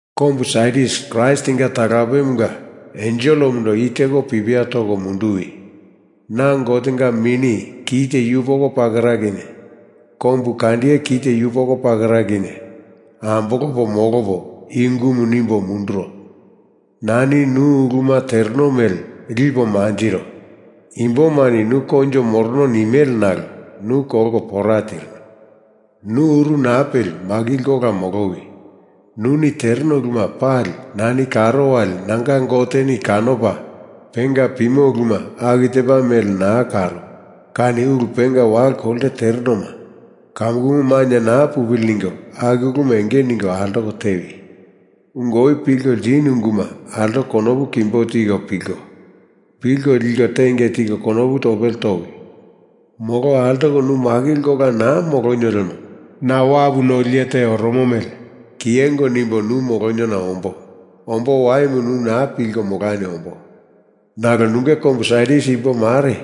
“Kombu Sardis Kraistinga talapemunga enselemundo i teko pipia toko munduwi. Na Gotenga mini kite yupoko pakera kinye kombukandiye kite yupoko pakera kinye ambolopo molopo i ungumu nimbo munduro. Nani nu uluma tereno mele lipo manjiro. Imbomani nu koinjo morono nimele nalo nu kolko pora tirinu. Nu uru naa peli makilko ola molowi! Nuni tereno uluma pali nani karo wali nanga Goteni kanopa penga pimo uluma aku tepa mele naa karo kani ulu penga walo kolte terenoma kamukumu mainye naa pupili ningo aku uluma enge ningo altoko tewi! Ungu oi pilko ltinu unguma altoko konopu kimbo tiko pilko, pilko liko tenge tiko konopu topele towi! Molo altoko nu makilko ola naa molonio lemo na wapu noli iye te oromo mele kiyengo nimbo nu moloniona ombo. Ombo waimu nu naa pilko molani ombo. Nalo nunge kombu Sardis imbo mare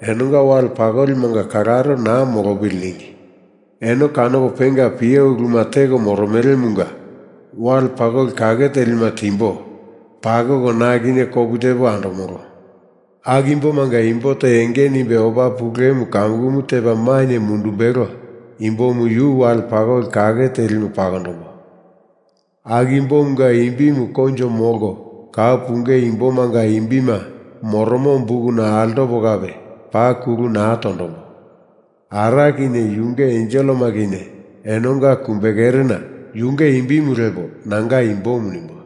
enonga wale pakolimanga kalaro naa molopili ningi. Eno kanopo penga pio uluma teko moromelemunga wale pakoli kake telima timbo pakoko na kinye kopu tepo andomolo. Aku imbomanga imbo te enge nimbe opa pulemu kamukumu tepa mainye mundumbelo imbomu yu wale pakoli kake telimu pakondombo. Aku imbomunga imbimu koinjo molko kau punge imbomanga imbima moromo bukuna altopa kape paa kulu naa tondombo. Ara kinye yunge enselema kinye enonga kumbe kerena yunge imbimu lepo nanga imbomu nimbo.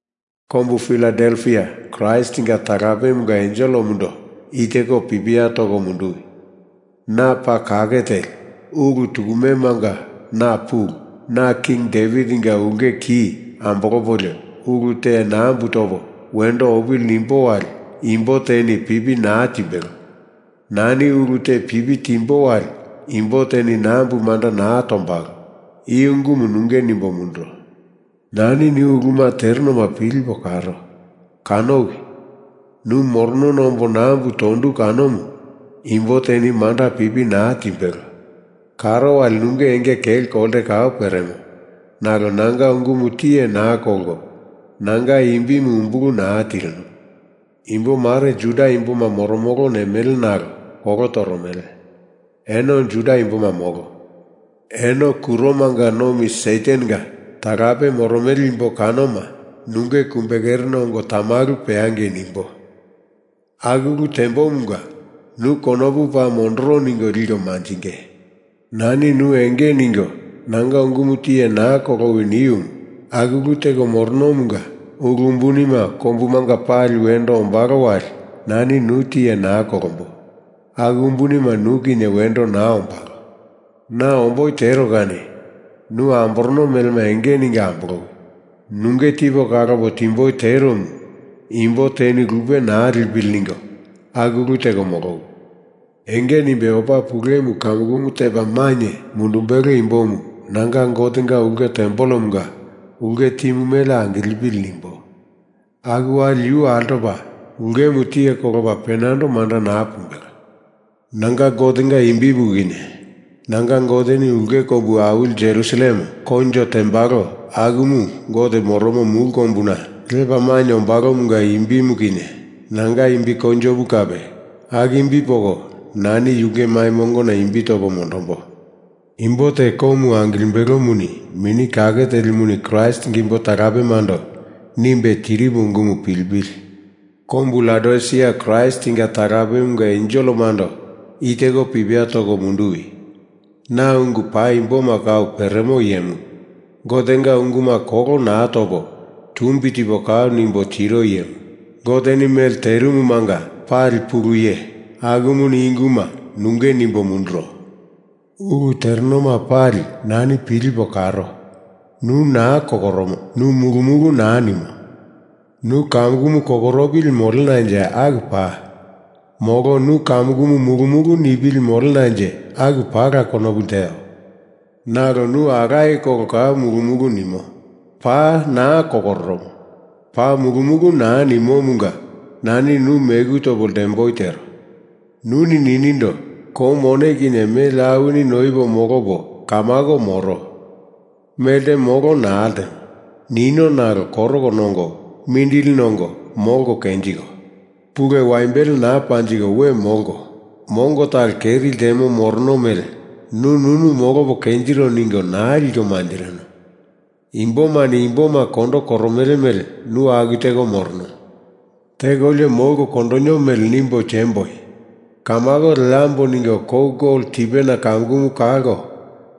“Kombu Filadelfia Kraistinga talapemunga enselemundo i teko pipia toko munduwi. Na paa kake teli, ulu tukumemanga na pulu, na King Devitinga ulke ki ambolopolio ulu te nambu topo wendo opili nimbo wali imbo teni pipi naa timbelo. Nani ulu te pipi timbo wali imbo teni nambu manda naa tombalo. I ungumu nunge nimbo munduro. Nani nu uluma terenona pilipo karo. Kanowi! Nu moronona ombo nambu tondu kanomu imbo teni manda pipi naa timbelo. Karo wali nunge enge kelo kolte kau peremo nalo nanga ungumu tiye naa kolko, nanga imbimu umbulu naa tirino. Imbo mare Juda imboma moromolo nimele nalo kolo toromele. Eno Juda imboma molo. Eno kuromanga nomi Satanenga talape moromele imbo kanoma nunge kumbe kerena ongo tamalu peangei nimbo. Aku ulu tembomunga nu konopu paa mondoro ningo liko manjinge. Nani nu enge ningo nanga unguma tiye naa kolowi niumu aku ulu teko moronomunga ulu umbunima kombumanga pali wendo ombalo wali nani nu tiye naa kolombo. Aku umbunima nu kinye wendo naa ombalo. Na omboi tero kani nu amborono melema enge ningo ambolowi! Nunge tipo kalopo timboi teromu imbo teni lupe naa lipili ningo aku ulu teko molowi! Enge nimbe opa pulemu kamukumu tepa mainye mundumbelo imbomu nanga Gotenga ulke tempelemunga ulke timu mele angilepili nimbo. Aku wali yu altopo ulkemu tiye kolopa penando manda naa pumbelo. Nanga Gotenga imbimu kinye, nanga Goteni ulke kombu awili Jerusalem koinjo tembalo akumu Gote moromo mulu kombuna lepa mainye ombalomunga imbimu kinye, nanga imbi koinjomu kape, aku imbi poko nani yunge mai mongona imbi topo mondombo. Imbo te komu angilimbelomuni Mini Kake Telimuni Kraistinga imbo talapemando nimbe tirimu ungumu pilipili!” “Kombu Laodisia Kraistinga talapemunga enselemundo i teko pipia toko munduwi. Na ungu paimboma kau peremo iyemu, Gotenga unguma kolo naa topo tumbi tipo kau nimbo tiro iyemu, Goteni mele terimumanga pali Pulu Iye, akumuni i unguma nunge nimbo munduro. Ulu terenoma pali nani pilipo karo. Nu naa kokoromo. Nu mulu mulu naa nimo. Nu kamukumu kokoropili molenanje aku paa. Molo nu kamukumu mulu mulu nipili molenanje aku paala konopu lteo. Nalo nu alaye kolo kau mulu mulu nimo. Paa naa kokoromo, paa mulu mulu naa nimomunga nani nu meku topo ltemboi tero. Nuni ninindo, ‘Kou mone kinye mele awini noipo molopo kamako moro. Melte molo naa ltemo,’ nino nalo koroko nongo mindili nongo molko kenjiko, pulu waimbele naa panjiko we molko, mongo talo keri ltemo morono mele nu nunu molopo kenjiro ningo naa liko manjirino. Imbomani imboma kondo koromele mele nu aku teko morono. Tekolio molko kondonio mele nimbo tiemboi. Kamako leambo ningo kou gol tipena kamukumu kalko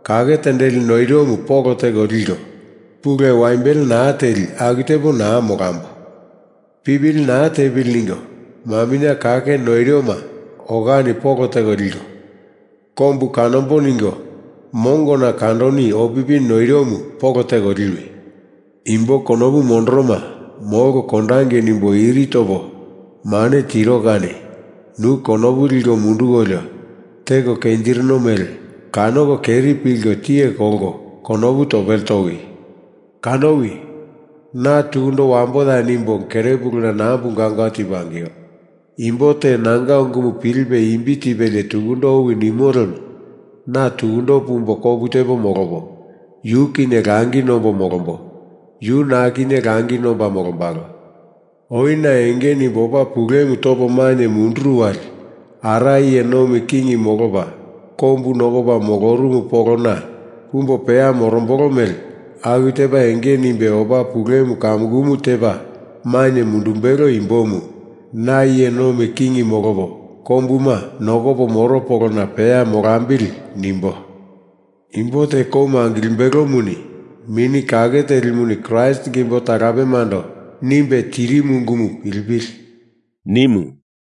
kake tendeli noiromu polo teko liko, pulu waimbele naa teli aku tepo naa molambo! Pipili naa tepili ningo maminye kake noiroma okani polo teko liko, kombu kanambo ningo mongona kandonio opipi noiromu polo teko liwi! Imbo konopu mondoroma Molko kondangei nimbo iri topo mane tiro kani nu konopu liko mundukolio teko kenjirino mele kanoko keri pilko tiye kolko konopu topele towi! Kanowi! Na tukundo wamboya nimbo kere puluna nambu gaungau tipo angio. Imbo te nanga ungumu pilipe imbi tipelie tukundo owi nimo lemo na tukundo pumbo kopu tepo molopo, yu kinye langi nombo molombolo. Yu na kinye langi nomba molombalo. Oi na enge nimbo opa pulemu topo mainye munduru wali Ara iye nomi king molopa kombu nokopa molorumu polona pumbo peya morombolo mele aku tepa enge nimbe opa pulemu kamukumu tepa mainye mundumbelo imbomu na iye nomi king molopo kombuma nokopo moro polona peya molambili nimbo. Imbo te komu angilimbelomuni Mini Kake Telimuni Kraistinga imbo talapemando nimbe tirimu ungumu pilipili!” nimu.